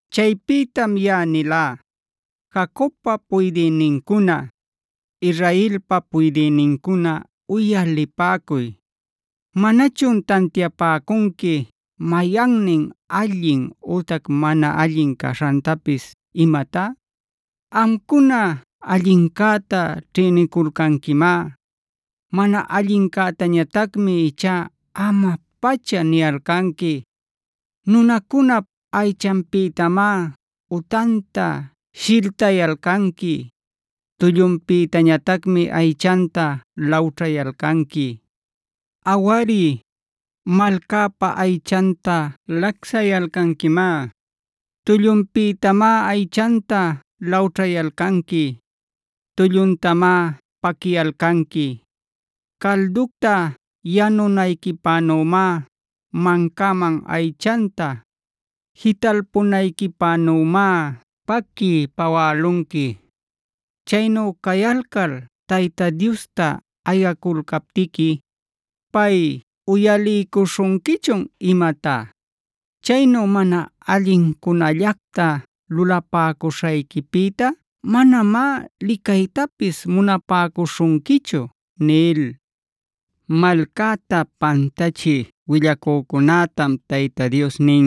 Chaypïtam yaꞌa nilá: “Jacobpa puydïnincuna, Israelpa puydïnincuna uyalipäcuy. ¿Manachun tantiapäcunqui mayannin allin ütac mana allin caśhantapis imatá? Amcuna allincäta ćhïniculcanquimá; mana allincätañatacmi ichá ama-pacha niyalcanqui. Nunäcunap aychanpïtamá utanta shiltayalcanqui; tullunpïtañatacmi aychanta lawćhayalcanqui. Awari, malcäpa aychanta lacsayalcanquimá; tullunpïtamá aychanta lawćhayalcanqui; tulluntamá paquiyalcanqui. Calducta yanunayquipänümá, mancaman aychanta jitalpunayquipänümá paquiy pawälunqui. Chaynu cayalcal Tayta Diosta ayaculcaptiqui, ¿pay uyaliycuśhunquichun imatá? Chaynu mana allincunallacta lulapäcuśhayquipïta manamá licaytapis munapäcuśhunquichu” nil. Malcäta pantachï willacücunätam Tayta Dios nin: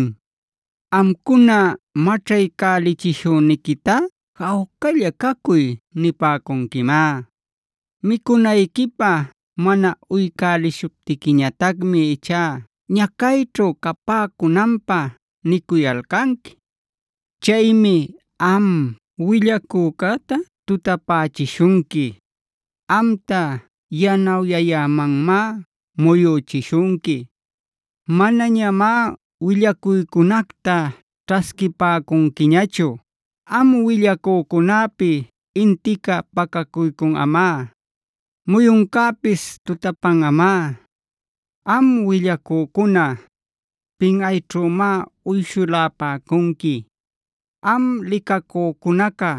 “Amcuna maćhaycälichishüniquitá ‘jawcalla caycuy’ nipäcunquimá. Micunayquipä mana uycälishuptiquiñatacmi ichá ñacayćhu capäcunanpä nicuyalcanqui. Chaymi am willacücäta tutapächishunqui; amta yanawyayämanmá muyüchishunqui. Manañamá willacuycunacta ćhasquipäcunquiñachu Am willacücunäpi intica pacacuycunꞌamá; muyuncäpis tutapanꞌamá. Am willacücuna, pinꞌayćhümá uyshulapäcunqui; am licacücunaca,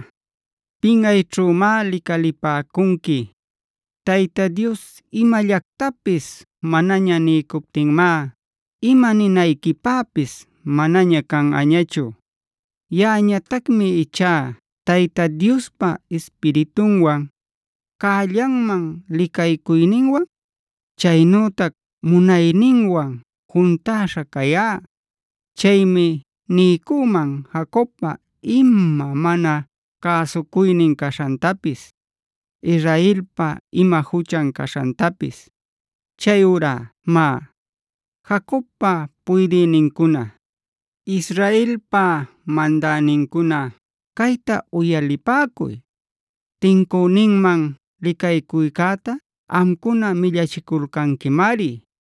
pinꞌayćhümá licalipäcunqui. Tayta Dios imallactapis manaña niycuptinmá ima ninayquipäpis manaña canꞌañachu. “Yaꞌañatacmi ichá Tayta Diospa Ispiritunwan, cällanman licaycuyninwan, chaynütac munayninwan juntäśha cayá. Chaymi niycüman Jacobpa ima mana cäsucuynin caśhantapis, Israelpa ima juchan caśhantapis. Chayurá má, Jacobpa puydïnincuna, Israelpa mandänincuna cayta uyalipäcuy. Tincüninman licaycuycäta amcuna millachiculcanquimari;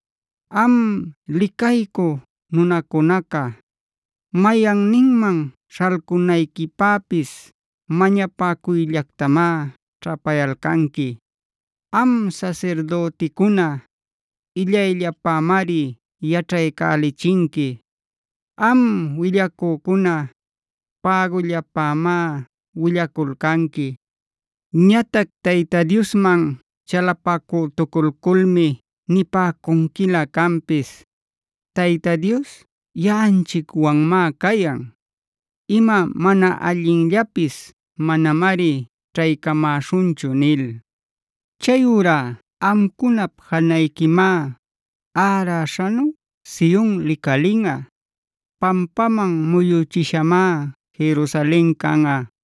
Am licaycü nunacunaca, mayanninman śhalcunayquipäpis mañapacuyllactamá ćhapayalcanqui. Am sasirdüticuna, illayllapämari yaćhaycälichinqui. Am willacücuna, pägullapämá willaculcanqui. Ñatac Tayta Diosman chalapacütuculculmi nipäcunquilä canpis: ‘Tayta Dios yaꞌanchicwanmá cayan. Ima mana allinllapis manamari ćhaycamäśhunchu’ nil. Chayurá amcunap janayquimá, äräśhanu Sion licalinꞌa. Pampaman muyüchishamá Jerusalen canꞌa.